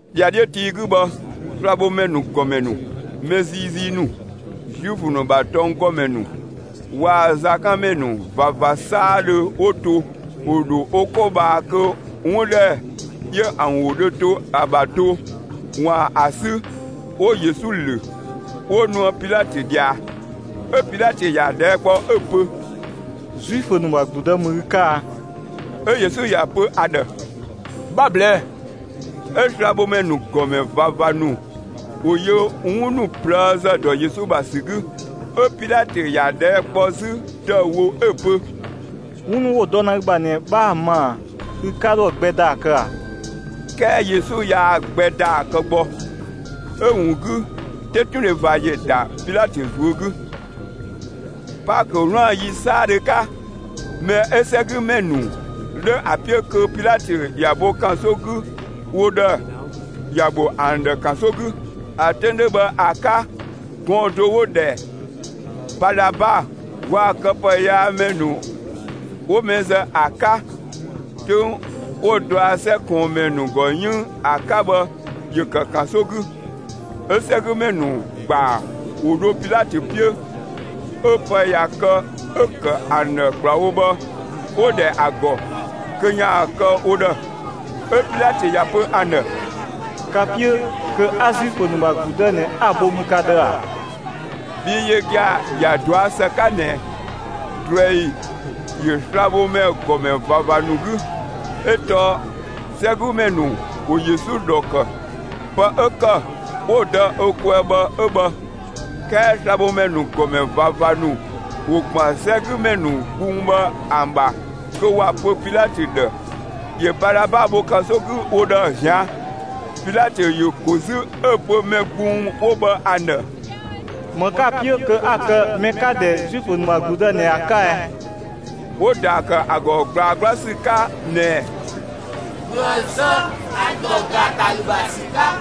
‑Dhiadhiö tii 'gü bhë, slabhomɛ ‑nu ‑gɔmɛ ‑nu, mɛ ziizii ‑nu, Zuifö ‑nu ‑bha tɔnggɔmɛ ‑nu waa‑ zakanmɛ ‑nu ꞊vava 'saadhö 'wo to, ‑wo ‑dho wo 'ko ꞊bhaa kö 'wun ‑dhɛ 'yö ‑an ‑wo dhö to ‑a ‑bha do, ‑waan ‑a 'sü, 'wo Yesu ‑lö, 'wo nuë Pilatö ꞊dhia. 'Ö Pilatö ‑ya ꞊dhɛɛ' kpɔ, 'ö‑ pö: «Zuifö ‑nu ‑bha ‑gludë ‑mü ü 'ka a?» 'Ö Yesu ‑ya pö ‑a ‑dhë: «'Bha‑ ꞊blɛɛ'‑.» 'Ö slabhomɛ ‑nu ‑gɔmɛ ꞊vava ‑nu ‑wo yö 'wun ‑nu ꞊plëëzë ‑dɔ Yesu ‑bha ‑sü 'gü. 'Ö Pilatö ‑ya ꞊dhɛɛ' kpɔ 'zü ‑dëüwo 'ö‑ pö: «'Wun ‑nu 'wo‑ dɔ ‑na ü ‑bha ꞊nɛ 'bhaa‑ ma ꞊a? Ü 'ka 'dho ‑a gbɛ ‑daa kë ꞊a?» 'Kɛɛ Yesu yaa‑ gbɛ ‑daa kë gbɔ, 'ö‑ ‑wun 'gü, 'tetundhe ꞊va ‑yö ‑da Pilatö ꞊zuö' 'gü. Paakö 'wlaan‑ ‑yi 'saadhö 'ka, mɛ 'ö 'sɛgümɛ ‑nu 'dhö ‑a 'piö, kö Pilatö ‑ya bho ‑kanso 'gü wo ‑dhë, ‑ya bho ‑an ‑dhë ‑kanso 'gü. ‑A 'töng 'dhö bhë ‑a 'ka, gɔɔn‑ do 'wo‑ ‑dhɛ Balaba waa‑ këpëyaamɛ ‑nu 'wo mɛ zë ‑a 'ka 'töng 'wo dɔa 'sɛ ꞊kɔɔnmɛ ‑nu ‑gɔ 'yënng ‑a 'ka bhë ‑yö ‑kë ‑kanso 'gü. 'Ö 'sɛgümɛ ‑nu ‑gbaa ‑wo dho Pilatö 'piö. 'Ö pë ꞊ya kë 'ö‑ ‑kë ‑an ‑dhë ‑kplawo bhë 'wo‑ ‑dhɛ ‑a ‑gɔ kö ‑yaan kë wo ‑dhë. 'Ö Pilatö ‑ya pö ‑an ‑dhë: «Ka‑ 'piö kö 'a Zuifö ‑nu ‑bha ‑gludë ꞊nɛ, 'a‑ bho mü ka ‑dhë ‑a?» Bhii yö gia‑ ‑ya ꞊dɔa' ‑së 'ka ꞊nɛ ꞊druɛi ‑yö slabhomɛ ‑gɔmɛ ꞊vava ‑nu 'gü, 'ö tɔɔ 'sɛgümɛ ‑nu ‑wo Yesu ‑dhɔ ‑kë, pë 'ö ‑kë 'wo‑ dɔ ö kwɛɛ bhë 'ö bhë. 'Kɛɛ slabhomɛ ‑nu ‑gɔmɛ ꞊vava ‑nu ‑wo ‑gban 'sɛgümɛ ‑nu gbung bhë ‑an ‑bha kö ‑wa pö Pilatö ‑dhë ‑yö Balaba bho ‑kanso 'gü wo ‑dhë ꞊zian'. Pilatö ‑yö ‑ko 'zü 'ö‑ pö mɛ gbung 'wo bhë ‑an ‑dhë: «‑Më 'ka‑ 'piö kö 'a‑ kë mɛ 'ka‑ ‑dhɛ Zuifö ‑nu ‑bha ‑gludë ꞊nɛ ‑a 'ka ɛ?» 'Wo‑ ‑daa ‑kë ‑a ‑gɔ ꞊gblaa 'gbla ‑sü 'ka ꞊nɛɛ: «‑Bhö ‑a zë, ‑a ‑dɔ ‑gaatalü ‑bha ‑sü 'ka!»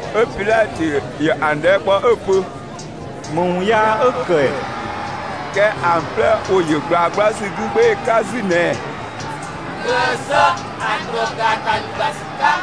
'Ö Pilatö ‑yö ‑an ꞊dhɛɛ' kpɔ 'ö‑ pö: «‑Më ‑wun yaa 'ö‑ ‑kë ‑ɛ?» 'Kɛɛ ‑an 'plɛ ‑wo ‑yö ꞊gblaa 'gbla ‑sü 'gü 'gbee‑ 'ka 'zü ꞊nɛɛ: «‑Bhö ‑a zë ‑a ‑dɔ ‑gaatalü ‑bha ‑sü 'ka!»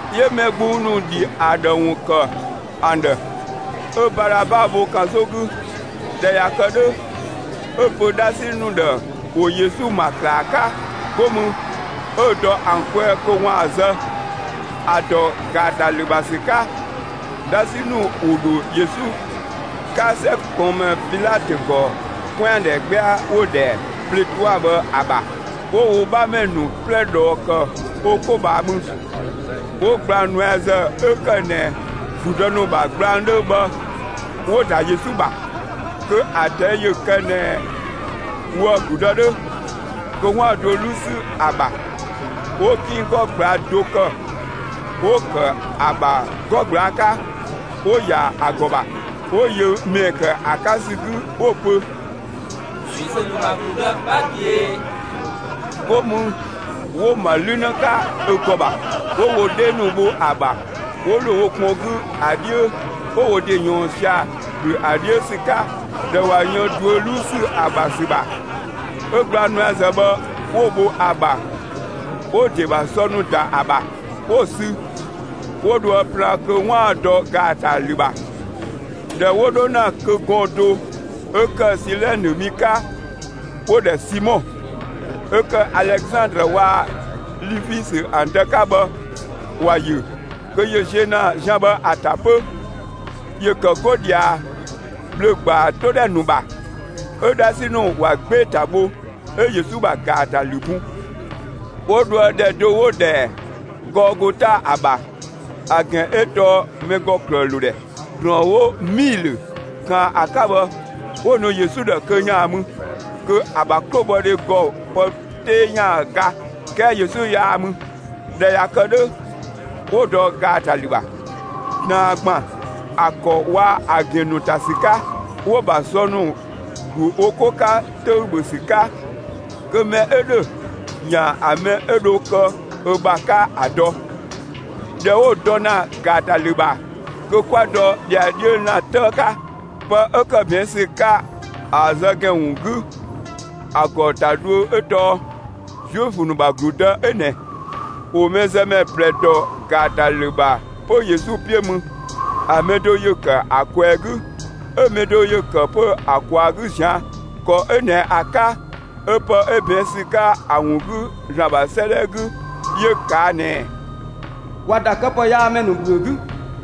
'Yö mɛ gbung ‑nu ‑dhi ‑a ‑dhë ‑wun ‑kë ‑an ‑dhë 'ö Balaba bho ‑kanso 'gü. ꞊Dhɛ ꞊ya kë 'dhö, 'ö‑ pö 'dhasi ‑nu ‑dhë ‑wo Yesu ‑ma ‑klaa 'ka. 'Go mü, 'ö‑ ‑dɔ ‑an kwɛɛ kö ‑waan zë, ‑a ‑dɔ ‑gaatalü ‑bha ‑sü 'ka. 'Dhasi ‑nu ‑wo ‑dho Yesu 'ka 'sɛ ꞊kɔɔnmɛ Pilatö ‑gɔ 'kwɛandhɛ 'gbɛa 'wo‑ ‑dhɛ pletua bhë ‑a ‑bha. 'Wo wo 'bhamɛ ‑nu 'plɛ ꞊dhɔɔ ‑kë wo 'ko ꞊bhaa mü. 'Wo gblang nuɛazë ('ö ‑kë ꞊nɛ ‑gludë ‑nu ‑bha gblang 'dhö bhë, 'wo‑) ‑da Yesu ‑bha. Kö ‑a ꞊tɛi' ‑yö ‑kë ꞊nɛ woë‑ ‑gludë 'dhö, kö 'waan‑ duö 'luu ‑sü ‑a ‑bha. 'Wo 'ginng 'gɔ ꞊gblaa' do ‑kë, 'wo‑ ‑kë ‑a ‑bha 'gɔ ꞊gblaa' 'ka, 'wo‑ ‑ya ‑a ‑gɔ ‑bha. 'Wo yö ‑mɛɛ ‑kë ‑a 'ka ‑sü 'gü 'wo‑ pö: «Zuifö ‑nu ‑bha ‑gludë, 'bha ꞊büee!» 'Go mü 'wo‑ ‑ma 'lü 'në 'ka ö ‑gɔ ‑bha, 'wo wo 'dhee ‑nu bho ‑a ‑bha, 'wo ‑lo wo kpɔn 'gü ‑a 'dhiö, 'wo wo ‑de ꞊yɔɔn sia‑, ‑gblü ‑a 'dhiö ‑sü 'ka. ꞊Dhɛ ꞊wa yën duö 'luu ‑sü ‑a ‑bha ‑sü ‑bha, 'ö gblang nuɛazë bhë 'wo‑ bho ‑a ‑bha, 'wo‑ ‑de ‑bha sɔ ‑nu ‑da ‑a ‑bha, 'wo‑ sü, 'wo dhoë plaan kö 'waan‑ dɔ ‑gaatalü ‑bha. ꞊Dhɛ 'wo 'dho ‑na kö gɔɔn‑ do 'ö ‑kë Silɛnë mi 'ka 'wo‑ ‑dhɛ Simɔ, 'ö ‑kë Alezandrë waa‑ Lifisö ‑an dë 'ka bhë, ‑wa ‑yö kö ‑yö ziö ‑na zian bhë ‑a ‑ta 'pö. ‑Yö ‑kë 'go ꞊dhia bhlö‑ ‑gbaa 'to ‑dhɛ ‑nu ‑bha. 'Ö 'dhasi ‑nu ‑wa 'gbee‑ ‑ta bho; 'ö Yesu ‑bha ‑gaatalü bun. 'Wo dhoë ‑dhɛ do 'wo‑ ‑dhɛ Gɔɔgota ‑a ‑bha, ‑a ‑gɛn 'ö tɔɔ «mɛ ‑gɔ ‑klëë ‑lo ‑dhɛ». ‑Drɔɔn 'wo 'miilö ꞊kaan ‑a 'ka bhë, 'wo‑ nu Yesu ‑dhë kö ‑yaan mü, (kö ‑a ‑bha 'klobhɔdhe ‑gɔ pë 'tee ‑yaan ga,) 'kɛɛ Yesu yaa‑ mü. ꞊Dhɛ ꞊ya kë 'dhö, 'wo‑ dɔ ‑gaatalü ‑bha, ꞊taan ‑gban ‑a ‑kɔ waa‑ ‑a ‑gɛn ‑nu ‑ta ‑sü 'ka. 'Wo‑ ‑bha sɔ ‑nu ‑glu wo 'ko 'ka 'töü‑ ‑bhö ‑sü 'ka kö mɛ 'ö ‑dhö ‑yaan ‑a mɛ 'ö dho kë ö ‑bha 'ka ‑a dɔ. ꞊Dhɛ 'wo‑ dɔ ‑na ‑gaatalü ‑bha kö 'kwa dɔ ‑dhiadhiö ‑lan 'tëë 'ka. Pë 'ö ‑kë ꞊bɛɛn' ‑sü 'ka ‑a zë ‑gɛn ‑wun 'gü, ‑a ‑gɔ ‑ta dhuö 'ö tɔɔ «Zuifö ‑nu ‑bha ‑gludë 'ö ꞊nɛ». ‑Wo mɛzëmɛ ꞊plɛ ‑dɔ ‑gaatalü ‑bha 'pö Yesu 'piö mü; ‑a mɛ do ‑yö ‑kë ‑a ꞊kwɛɛ‑ 'gü, 'ö‑ mɛ do ‑yö ‑kë 'pö ‑a ꞊kwaa‑ 'gü ꞊zian'. [‑Kɔ 'ö ꞊nɛ ‑a 'ka, 'ö pë 'ö ꞊bɛɛn' ‑sü 'ka ‑a ‑wun 'gü ‑Zlan ‑bha 'sëëdhɛ 'gü 'yö ꞊kaa' ꞊nɛɛ: ‑Wa ‑da këpëyaamɛ ‑nu ‑bhüö 'gü.]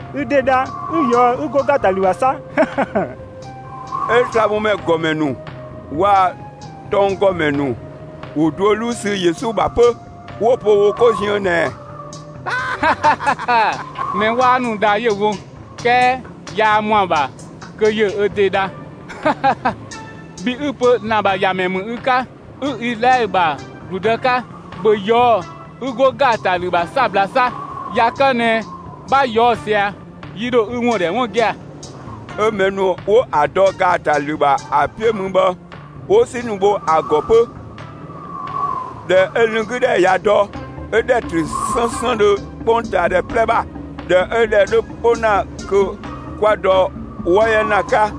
Ü ‑de dha 'ü ꞊yɔɔ'‑ 'ü 'go ‑gaatalü ‑bha 'sa!» 'Ö slabhomɛ ‑gɔmɛ ‑nu waa‑ tɔnggɔmɛ ‑nu ‑wo duö 'luu sü Yesu ‑bha 'pö, 'wo‑ pö wo 'ko ziën ꞊nɛɛ: «Mɛ 'waa ‑nu dha 'yö‑ wo, 'kɛɛ yaa ‑mɔ ‑a ‑bha kö ‑yö ö ‑de dha! Bhi 'ü‑ pö ü ‑Zlan ‑bha ‑Yamɛ ‑mü ü 'ka, 'ü Izlaɛlö ‑bha ‑gludë 'ka, ‑bhö ꞊yɔɔ'‑ 'ü 'go ‑gaatalü ‑bha 'sabla 'sa! ꞊Ya kë ꞊nɛ, 'bha ꞊yɔɔ'‑ ꞊sia, yi ‑dho ü ‑wun ‑dhɛ 'wun gia‑!» 'Ö mɛ ‑nu 'wo ‑an dɔ ‑gaatalü ‑bha ‑a 'piö mü bhë 'wo 'si ‑nu bho ‑a ‑gɔ 'pö. ꞊Dhɛ 'ö lënng 'gü ‑dhɛ ꞊ya dɔ, 'ö ‑dhɛ ‑trö 'sënsëndhö 'kpongtaadhɛ 'plɛ ‑bha. ꞊Dhɛ 'ö ‑dhɛ 'dhö 'po ‑na kö 'kwa dɔ 'wɔ 'yɛ ‑lan 'ka.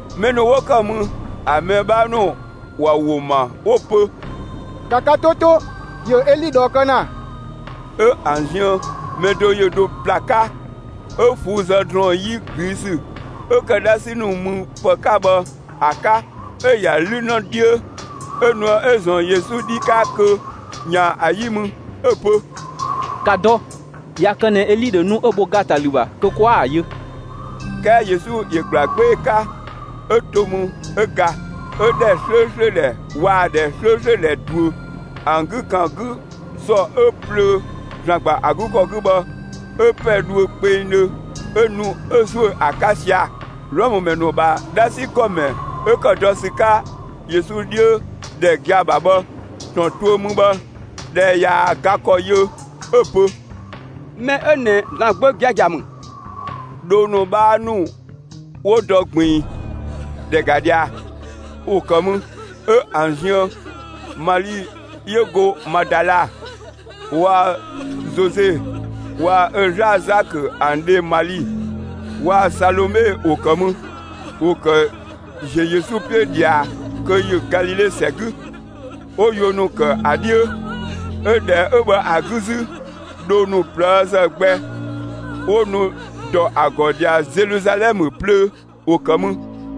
Mɛ ‑nu 'wo ‑kë mü, ‑a mɛ 'bhaa ‑nu ‑wa ‑wo ‑ma 'wo‑ pö: «‑Ka ka 'to 'to, ‑yö Eli ꞊dhɔɔ kë ‑na!» 'Ö ‑an ziën mɛ do ‑yö dho ‑bla 'ka, 'ö ꞊fuu'‑ zë ‑drɔɔn 'yi ꞊gliisü, 'ö ‑kë 'dhasi ‑nu müpë 'ka bhë ‑a 'ka. 'Ö‑ ‑ya 'lü 'në 'dhiö, 'ö nuë 'ö‑ ‑zɔn Yesu 'dhi 'ka kö ‑yaan ‑a 'yi mü, 'ö‑ pö: «‑Ka dɔ, ꞊ya kë ꞊nɛ Eli ‑dho nu 'ö‑ bho ‑gaatalü ‑bha kö 'kwaa‑ yö!» 'Kɛɛ Yesu ‑yö ‑gbla 'gbee‑ 'ka, 'ö to mü, 'ö ga. 'Ö ‑dhɛ 'slööslö ‑dhɛ waa‑ ‑dhɛ 'slööslö ‑dhɛ ꞊duö, ‑an 'gü ‑kan 'gü ‑sɔ 'ö plöö ‑Zlan ‑gba ‑a 'gü ‑kɔ 'gü bhë, 'ö ‑pɛ dhuö kpengdhö 'ö nu 'ö ‑zuö ‑a 'ka sia‑. Wlɔmë ‑mɛ ‑nu ‑bha 'dhasi ‑gɔmɛ 'ö ‑kë dɔ ‑sü 'ka Yesu 'dhiö ‑dhɛ gia‑ ‑bha bhë, ‑tɔn tuö mü bhë, ꞊dhɛ ꞊yaa‑ ga ‑kɔ yö 'ö‑ pö: «Mɛ 'ö ꞊nɛ ‑Zlan Gbö giagia ‑mü!» Dhoo ‑nu 'bhaa ‑nu 'wo dɔ ꞊gbiin, ‑dhɛ ‑ga ꞊dhia, ‑wo ‑kë mü. 'Ö ‑an ziën Mali 'yö go Madala, waa‑ Zoze waa‑ ö 'zlaa‑ Zakö ‑an dhe Mali, waa‑ Salome ‑wo ‑kë mü. ‑Wo ‑kë ‑ziö Yesu 'piö ꞊dhia kö ‑yö Galile ‑sɛ 'gü, 'wo yuö ‑nu ‑kë ‑a 'dhiö. 'Ö ‑dhɛ 'ö bhë ‑a 'gü 'zü, dhoo ‑nu ꞊plëëzë gbɛ 'wo nu ‑dɔ ‑a ‑gɔ ꞊dhia Zeluzalɛmë plöö, 'wo ‑kë mü.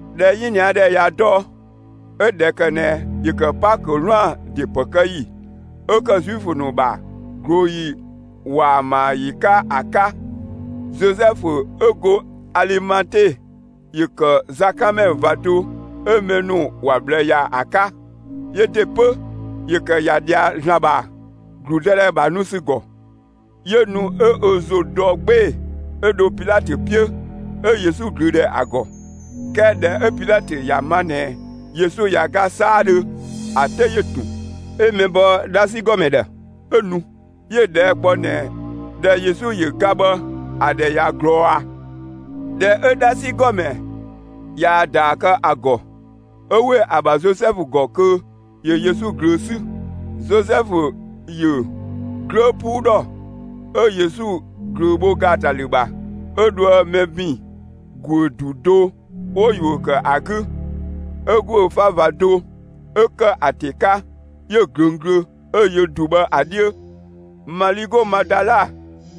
꞊Dhɛ 'yinia ‑dhɛ ꞊ya dɔ, 'ö ꞊dhɛ ‑kë ꞊nɛ ‑yö ‑kë Paakö 'wlaan‑ ‑de ‑pë kë ‑yi, 'ö ‑kë Zuifö ‑nu ‑bha ꞊glooyi ‑waamayi 'ka ‑a 'ka, Zozɛfu 'ö go Alimate ‑yö ‑kë zakanmɛ ꞊va do 'ö mɛ ‑nu ‑wa ꞊bhlë ‑ya ‑a 'ka. Yö ‑de 'pö, ‑yö ‑kë ‑ya ꞊dhia ‑Zlan ‑bha ‑gludëdhɛ ‑bha nu ‑sü ‑gɔ. 'Yö ‑nu 'ö ö ‑zo dɔ 'gbee‑, 'ö dho Pilatö 'piö, 'ö Yesu ꞊glöö ‑dhɛ ‑a ‑gɔ. 'Kɛɛ ꞊dhɛ 'ö Pilatö ‑ya ma ꞊nɛ Yesu ꞊ya ga 'saadhö, ‑a 'te ‑yö ‑tun, 'ö mɛ bɔ 'dhasi ‑gɔmɛ ‑dhë. 'Ö nu, 'yö‑ ꞊dhɛɛ' kpɔ ꞊nɛ ꞊dhɛ Yesu ‑yö ga bhë, ‑a ‑dhɛ ꞊ya ꞊glɔɔ ꞊a? ꞊Dhɛ 'ö 'dhasi ‑gɔmɛ ꞊yaa‑ ‑daa kë ‑a ‑gɔ, 'ö ‑we ‑a ‑bha Zozɛfu ‑gɔ kö ‑yö Yesu ꞊glöö 'sü. Zozɛfu ‑yö 'glöö 'puu ‑dhɔ, 'ö Yesu ꞊glöö bho ‑gaatalü ‑bha, 'ö dhoë mɛ ‑bin ‑guö ‑du do 'wo yuö ‑kë ‑a 'gü, 'ö ‑guö 'fa ꞊va do 'ö ‑kë ‑a ‑te 'ka, 'yö‑ ꞊glöng glö, 'ö‑ yö ‑du bhë ‑a 'dhiö. Mali 'go Madala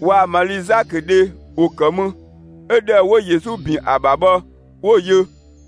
waa‑ Mali Zakö dhe ‑wo ‑kë mü 'ö ‑dhɛ 'wo Yesu ‑bin ‑a ‑bha bhë 'wo‑ ‑yö.